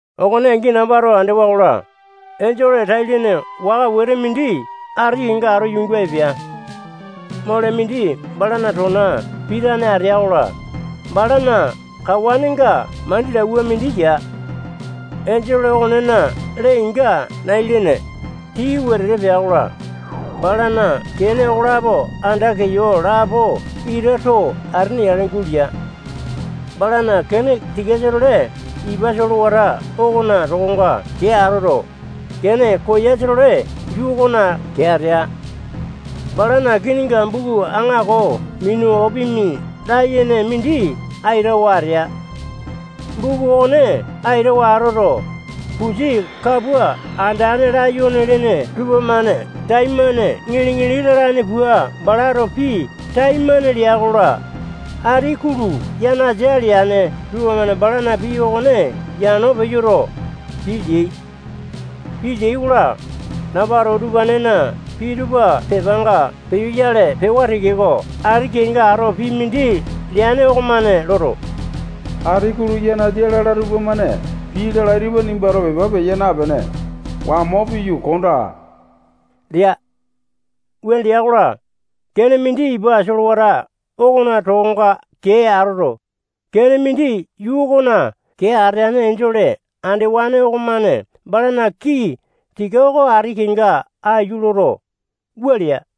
Okone angi nambato andewa-kola, enjole tai-lene waka wete mindi ati kenga ato yuunga epea. Mole mindi balana tona pitane atea-kola, balana kawanenga mandilauwa mindi ya. Enjole okonena lee-inga nai-lene, tii wetete pea-kola, balana kene okolapo anda keyo lapo ita too atene yale gulea. Balana kene tikasa-tole ipa solewata okona tokonga kee atoto, kene koyasa-tole yuu okona kee atea. Balana kininga buku aŋako minu opimi layene mindi aitawa atea. Buku okone aitawa atoto, pusi kapua andane layone lene tupamane taimane ŋili-ŋili lalane pua balato pii taimane lea-kola, ati kulu yanasa leane tupamane balana pii okone yano peyoto, pii leai. Pii leai-kola, nambato utupanena pii tupa pepanga peyoyale pewa tekeko, ati kenga ato pii mindi leane okomane loto, ati kulu yanasa lala tupamane pii lalai tupa nimbato pepa peya napene, wamo piyu kondaa lea. Wuane lea-kola, kene mindi ipa solewata okona tokonga kee atoto, kene mindi yuu okona kee ateane enjole andewane okomane balana kii tika oko ati kenga aiyu loto, wua lea: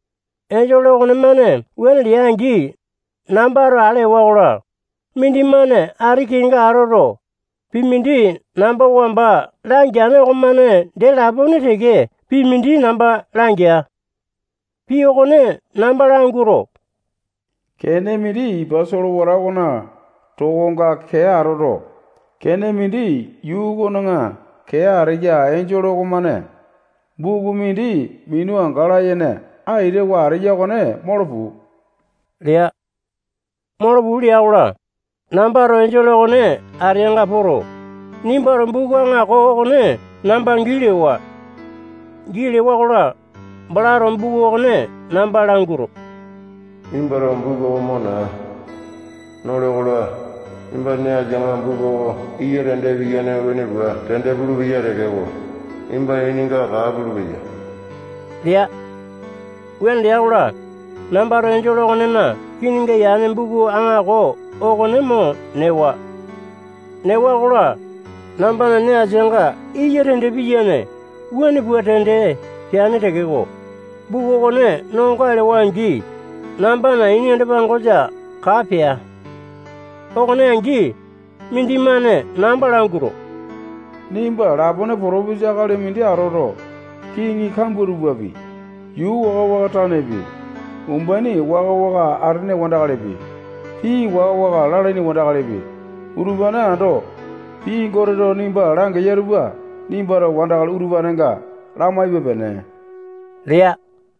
Enjole okonemane wuane lea-angi, nambato ale ewa-kola, mindimane ati kenga atoto, pii mindi namba wamba langeane okonemane dee lapone teke pii mindi namba langea. Pii okone namba languato, kene mindi ipa solewata okona tokonga kee atoto, kene mindi yuu okona kee ateya enjole okomane buku mindi minu anga layene aitawa ateya okone molo puu lea. Molo puu lea-kola, nambato enjole okone ateanga poto, nimbato buku aŋako okone namba gii lewa. Gii lewa-kola, balato buku okone namba languato, nimbato buku oko mo naa. Nole-kola, nimbana nee asianga buku oko iya tende piyane wuane pua tende pulupeya tekeko, nimbana ininga kaa pulupeya lea. Wuane lea-kola, nambato enjole okonena kininga yane buku aŋako okone mo newa. Newa-kola, nambana nee asianga iya tende piyane wuane pua tende peane tekeko, buku okone no goae lewa-angi, nambana ini anda-pangosa kaa pea. Okone angi, mindimane namba languato, nimba lapone potopesa akali mindi atoto, kiŋi kambua tupapi, yuu waka-waka tanepi, umbaini waka-waka atene wandakalipi, pii waka-waka lalaini wandakalipi, utupane ando pii Goteto nimba langeya tupa nimbato wandakali utupanenga lamaipe-pene lea.